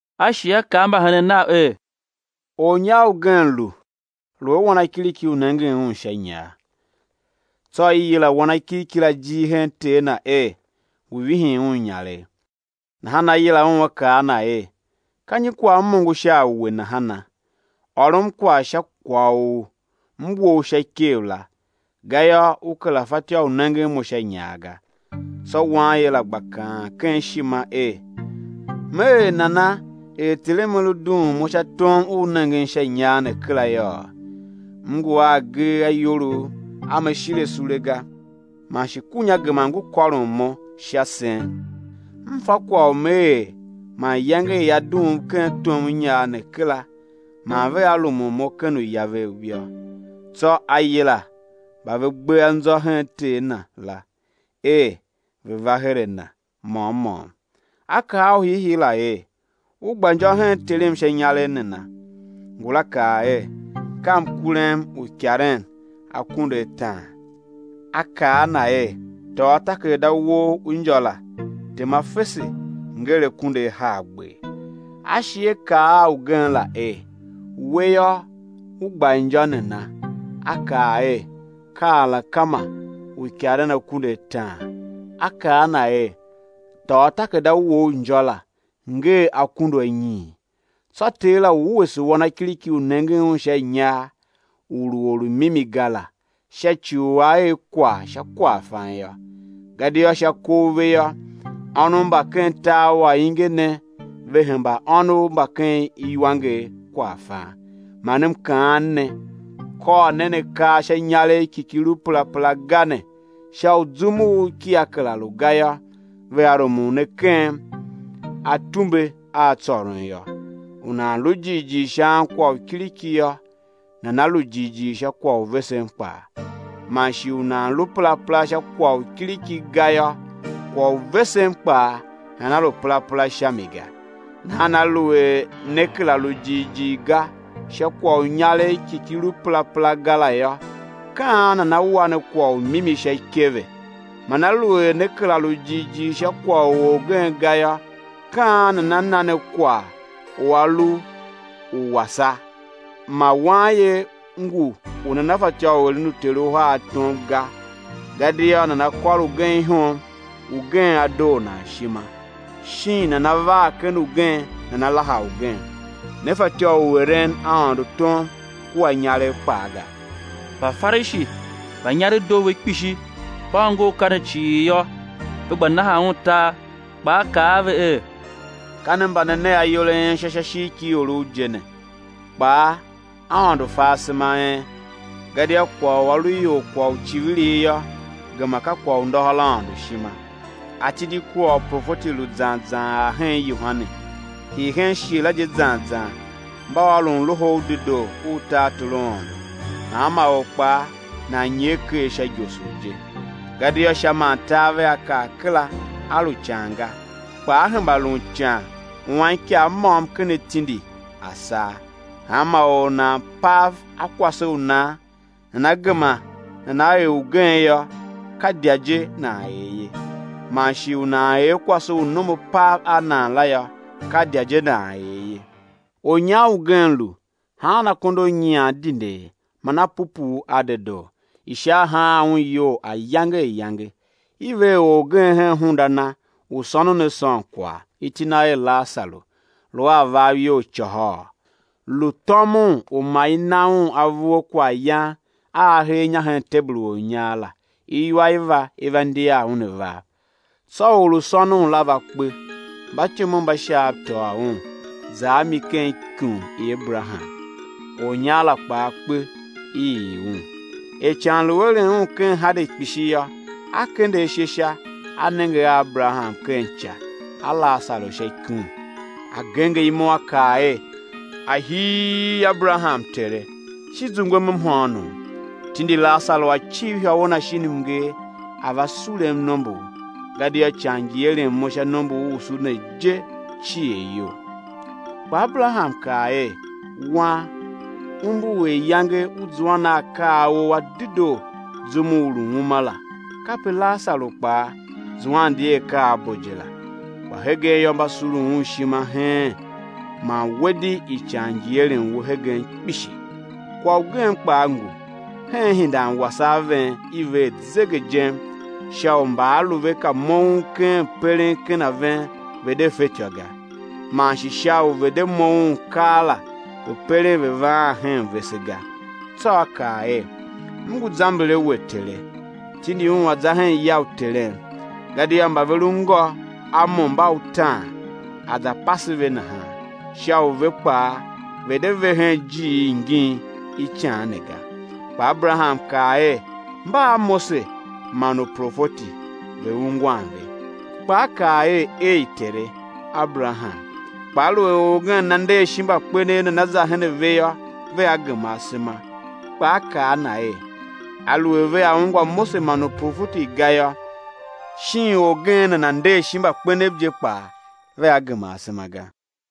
A shi A kaa a mbahenen Nav er: Ornyar ugen lu, lu a wanakiriki u nengen un sha inyar. Tsô i yila wanakiriki la ijir hen ter na er, ngu vihin un inyaregh. Nahan a yila un a kaa a na er: Ka nyi kwagh m ongo sha a we nahana? Ôrom kwagh sha kwagh u m we u sha ikev la, gayô u kera fatyô u nengen mo sha inyar ga. Tsô wanye la gba kaan ken ishima er: Me er nana er terem a lu dughun mo sha tom u nengen sha inyar ne kera yôô? M ngu a agee a iyolough a me shire sule ga; man shi kunya gema ngu kôron mo sha sen. M fa kwagh u me er man iyange i á dughum ken tom u inyar ne kera man vea rumun mo ken uya vev yô. Tsô a yila mba ve gbe anzô hen ter na la er ve̱ va her a na môm môm; a kaa a u hiihii la er: U gba injô hen terem sha inyaregh nana? Ngula kaa er: Ka mkurem uikaren akunduataan. A kaa a na er: Tôô takerada wou u injô la tema fese, nger akunduahargber. A shi a kaa a ugen la er: We yô, u gba injô nana? A kaa er: Ka alakema uikaren akunduataan. A kaa a na er: Tôô takerada wou u injô la, nger akunduanyiin. Tsô ter la wuese wanakiriki u nengen un sha inyar u lu or u mimi ga la, sha ci u a er kwagh sha kwaghfan yô, gadia sha kov ve yô, ônov mba ken tar u ainge ne ve hemba ônov mba ken iwanger kwaghfan. Man M kaan ne, kôr nen akar sha inyaregh ki ki lu perapera ga ne, sha u zum u kia kera lu ga yô, vea rumun ne ken atumbe a tsôron yô. U nan lu jighjigh sha ankwagh u kiriki yô, nana lu jighjigh sha kwagh u vesen kpaa; man shi u nan lu perapera sha kwagh u kiriki ga yô, kwagh u vesen kpaa nana lu perapera sha mi ga. Nahan aluer ne kera lu jighjigh ga sha kwagh u inyaregh ki ki lu perapera ga la yô, ka an nana wa ne kwagh u mimi sha ikeve? Man aluer ne kera lu jighjigh sha kwagh u orgen ga yô, ka an nana na ne kwagh u a lu u wene? Ma wanye ngu u nana fatyô u eren uter uhar tom ga; gadia nana kôr ugen ihom, ugen á doo nan ishima; shin nana var ken ugen, nana laha ugen. Ne fatyô u eren Aôndo tom kua inyaregh kpaa ga. Mbafarishi mba inyaregh doo ve kpishi, mba ongo akaa ne cii yô, ve gba nahan Un tar. Kpaa A kaa a ve er: Ka ne mba ne ne ayol a en ishô sha ishigh ki iorov je ne, kpaa Aôndo fa asema a en; gadia kwagh u a lu ior kwagh u icivirigh yô, gema ka kwagh u ndôhôr Aôndo ishima. Atindi kua uprofeti lu zan zan ar hen Yohane; hii hen shighe la je zan zan, mba ôron Loho u Dedoo u tartor u Aôndo, hanma or kpaa nan nyer ker sha igosor je. Gadia Sha man tar vea kar kera, á lu ican ga, kpa á hemba lun ican u anikav môm ken atindi á saa. Hanma or u nana pav a kwase u nan, nana gema nana er ugen yô, ka idya je nan er ye; man shi u nan er kwase u nom a pav a nan la yô, ka idya je nan er ye. Ornyar ugen lu, haan akondo a nyian dindee man a pupuu a dedoo, ishar haan un iyol ayange ayange. I ver orgen hen hunda na u sônon a sôn kwagh, iti na er Lasaru, lu a avav iyol côhôô, lu tômon u ma i na un avur a kwaghyan a a hee inya hen tebul u ornyar la; iwa i va, i va ndiar un avav. Tsô or u sônon la va kpe, mbatyomov mba Shaav tôô un, za a mi ken ikum i Aberaham. Ornyar la kpaa kpe, i ii un. Er ican lu eren un ken Hade kpishi yô, a kende ashe sha, a nenge a Aberaham ken ica a Lasaru sha ikum. A genger imo, a kaa er: Ahii Aberaham, tere! Shi zungwem mhôônom, tindi Lasaru a̱ civ ihôwe na shin mnger, a̱ va surum nombor, gadia ican ngi eren mo sha nomborusu ne je cier iyol. Kpa Aberaham kaa er: Wan, umbur er iyange u zuan a akaa a ou a dedoo zum u u lu uma la kape Lasaru kpaa zuan di a akaa a bo je la; kpa hegen yô, mba surun un ishima heen; man we di ican ngi eren we hegen kpishi. Kwagh ugen kpaa ngu, hen ihindan wase a ven i ver zegejem, sha u mba a lu ve ka moughon keen peren ken a ven, ve̱ de fetyô ga; man shi sha u ve̱ de moughon keela, ve̱ peren ve̱ vaan hen vese ga. Tsô a kaa er: M ngu zamber a we, tere; tindi un a̱ za hen ya u terem; gadia mba ve lu ngô a mo mba utaan, a̱ za pase ve nahan, sha u ve kpaa ve̱ de ve hen ijiir ingin i ican ne ga. Kpa Aberaham kaa er: Mba a Mose man uprofeti, ve̱ ungwan ve. Kpa a kaa er: Ei! tere, Aberaham, kpa aluer orgen nana nder shin mbakpenev, nana za her a ve yô, vea gema asema. Kpa a akaa a na er: Aluer vea ungwa Mose man uprofeti ga yô, shin orgen nana nder shin mbakpenev je kpaa, vea gema asema ga.